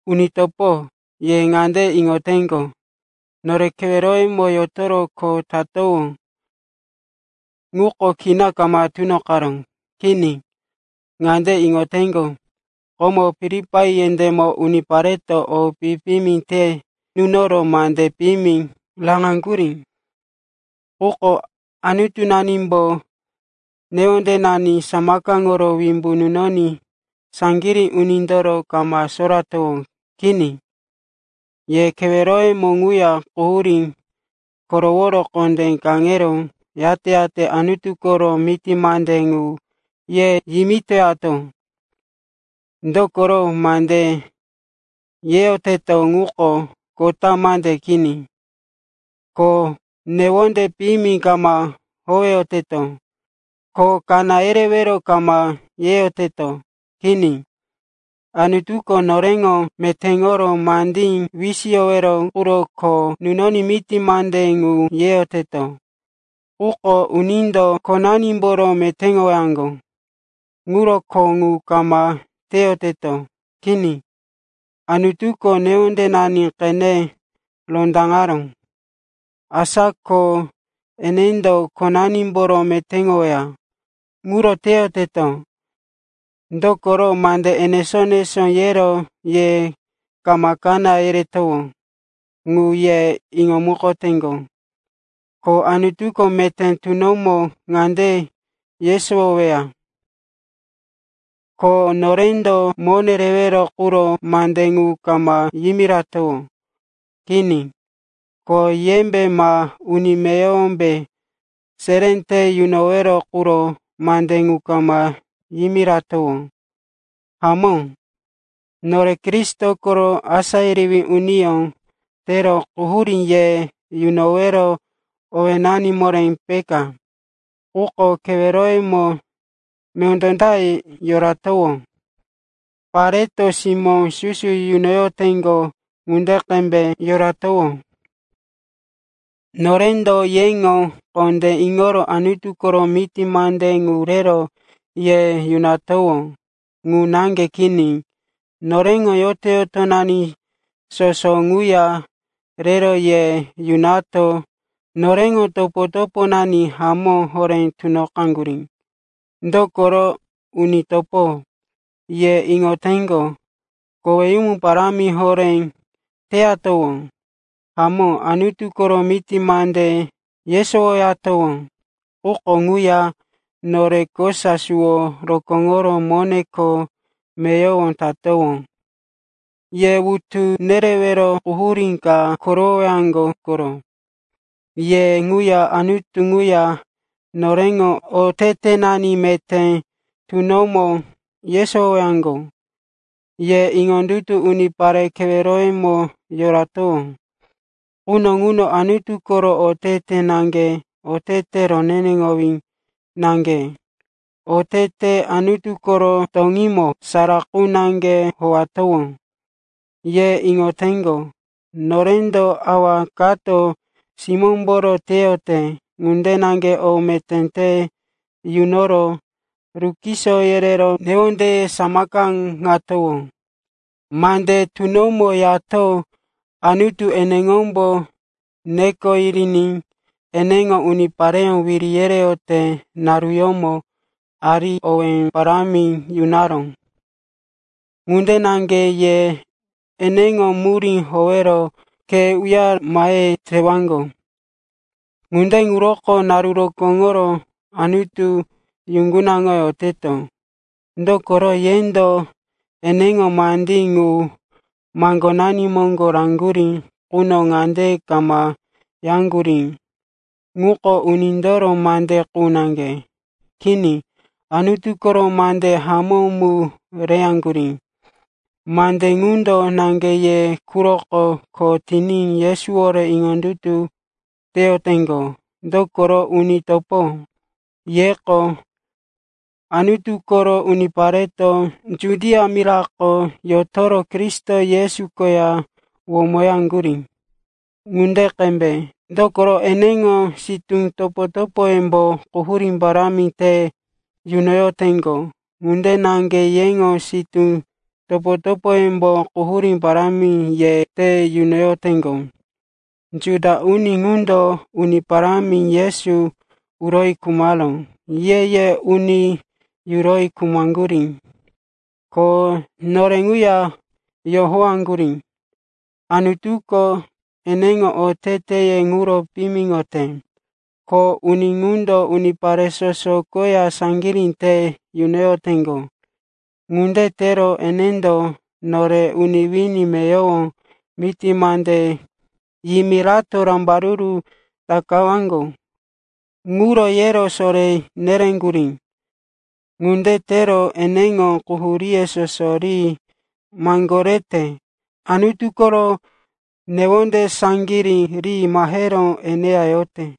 Uni topo, ye ŋande iŋoteŋgo, nore keweroyemo yotoro kho teyatowó ŋuko kina kama tunoqaró. Kini, ŋande iŋoteŋgo, komo Filipai yendémo unipareto o pi-piyimi te nunoro mande piyimi raŋaŋgurí. Quko Anutunanimbo newondenani samakaŋoro wimbu nunoní saŋgirí unindoro kama soratowó. Kini, ye keweroyemo ŋuya quhurí koroworo kondé kaŋero, yate-yate Anutu koro miti mande ŋu ye yimitoyato. Dokoro mande yeyoteto ŋuko kota mande kini, ko newonde piyimi kama howeyoteto, ko kaná yerewero kama yeyoteto. Kini, Anutuko noreŋo metéŋoro mandí wisiyowero quro kho nunoní miti mande ŋu yeyoteto. Quko unindo khonanimboro metéŋowaŋgo ŋuro kho ŋu kama teyoteto. Kini, Anutuko newondenani qene rondaŋaró, asa ko enendo khonanimboro metéŋoweya ŋuro teyoteto. Dokoro mande enesó-enesó yero ye kama kaná yeretowó, ŋu ye iŋomukoteŋgo. Ko Anutuko meté tunomo ŋande yesowoweya, ko norendo mone rewero quro mande ŋu kama yimiratowó. Kini. Ko yembe ma uni meyowombe seré te nunowero quro mande ŋu kama yimiratowó. Hamó, nore Kristo koro asá yerewí uniyó tero quhurí ye yunowero owénani moré peka. Quko keweroyemo mondó ta yoratowó, pareto simó susu yunoyoteŋgo ŋunde qembe yoratowó. Norendo yeŋo kondé iŋoro Anutu koro miti mande ŋu rero ye yunatowó. Ŋu naŋge kini, noreŋo yoto-yotonani soso ŋuya rero ye yunato noreŋo topo-toponani hamó horé tunoqaŋgurí. Dokoro, uni topo, ye iŋoteŋgo, koweyumu parámi horé teyatowó. Hamó, Anutu koro miti mande yesowoyatowó. Quko ŋuya nore kosa suwo rokóŋoro mone kho meyowo tatowó. Ye wutu nerero quhurí ka korowowaŋgo koro. Ye ŋuya Anutu ŋuya noreŋo otetenani meté tunomo yesowowaŋgo. Ye iŋondutu unipare keweroyemo yoratowó quno ŋuno Anutu koro otete naŋge, otete roneneŋowí naŋge, otete Anutu koro toŋímo sara qu naŋge howatowó. Ye iŋoteŋgo, norendo awa kato simómboro teyote ŋunde naŋge o meté te yunoro rukiso yerero newondeye samakaŋatowó. Mande tunomo yato Anutu eneŋombo neko yiriní eneŋo unipareyó wiri yereyote naruyómo ari owé parámi yunaró. Ŋunde naŋge ye eneŋo murí howero khe uyare mahe tewaŋgo. Ŋunde ŋuroko naru rokóŋoro Anutu yuŋgunaŋoyoteto. Dokoro yendo eneŋo mandí ŋu maŋgonani moŋgo raŋgurí quno ŋande kama yaŋgurí, ŋuko unindoro mande qu naŋge. Kini, Anutu koro mande hamó mu reyaŋgurí. Mande ŋundo naŋge ye quroko kho tiní Yesuwore iŋondutu teyoteŋgo. Dokoro, uni topo, yeko Anutu koro unipareto Judia mirako yotoro Kristo Yesu koya womoyaŋgurí ŋunde qembe. Dokoro eneŋo sitú topo-topoyembo quhurí parámi te yunoyoteŋgo. Ŋunde naŋge yeŋo sitú topo-topoyembo quhurí parámi ye te yunoyoteŋgo. Juda uni ŋundo Uni Parámi Yesu uroyi khumaró, ye-ye uni yuroyi khumaŋgurí, ko nore ŋuya yohowaŋgurí. Anutuko eneŋo oteteye ŋuro piyimiŋote, ko uni ŋundo unipare soso koya saŋgirí te yunoyoteŋgo. Ŋunde tero enendo nore uni wini meyowo miti mande yimirato rambaruru takawaŋgo ŋuro yero soré nereŋgurí. Ŋunde tero eneŋo quhuríye soso ri maŋgorete. Anutu koro newonde saŋgirí riní mahero eneya yorote.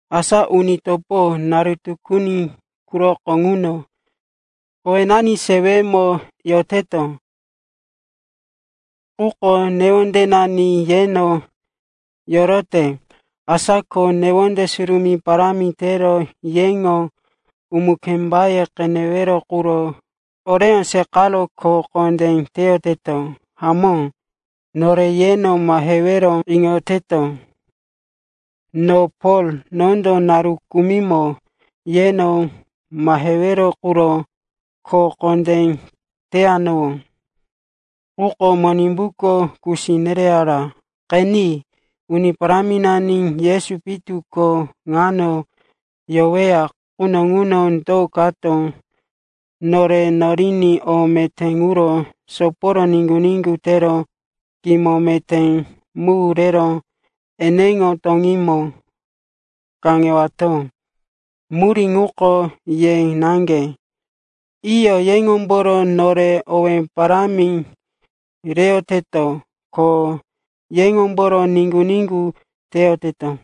Asa uni topo, naru tukuni quroko ŋuno kowenani sewemo yoteto, quko newondenani yeno yorote. Asa ko newonde surumí parámi tero yeŋo umu-kembaye qenewero quro oreyó seqaro kho kondé teyoteto. Hamó, nore yeno mahewero iŋoyoteto, no Pol, nondo naru kumimo yeno mahewero quro kho kondé teyanowó. Quko Monimbuko kusi nereyara. Qeni, Uni Paráminani Yesu pitu ko ŋano yoweya quno ŋuno do kato nore noriní o meté ŋuro soporo niŋgu-niŋgu tero kimo meté mu rero eneŋo toŋímo kaŋewato? Murí ŋuko ye naŋge. Iyo, yeŋomboro nore owé parámi reyoteto, ko yeŋomboro niŋgu-niŋgu teyoteto.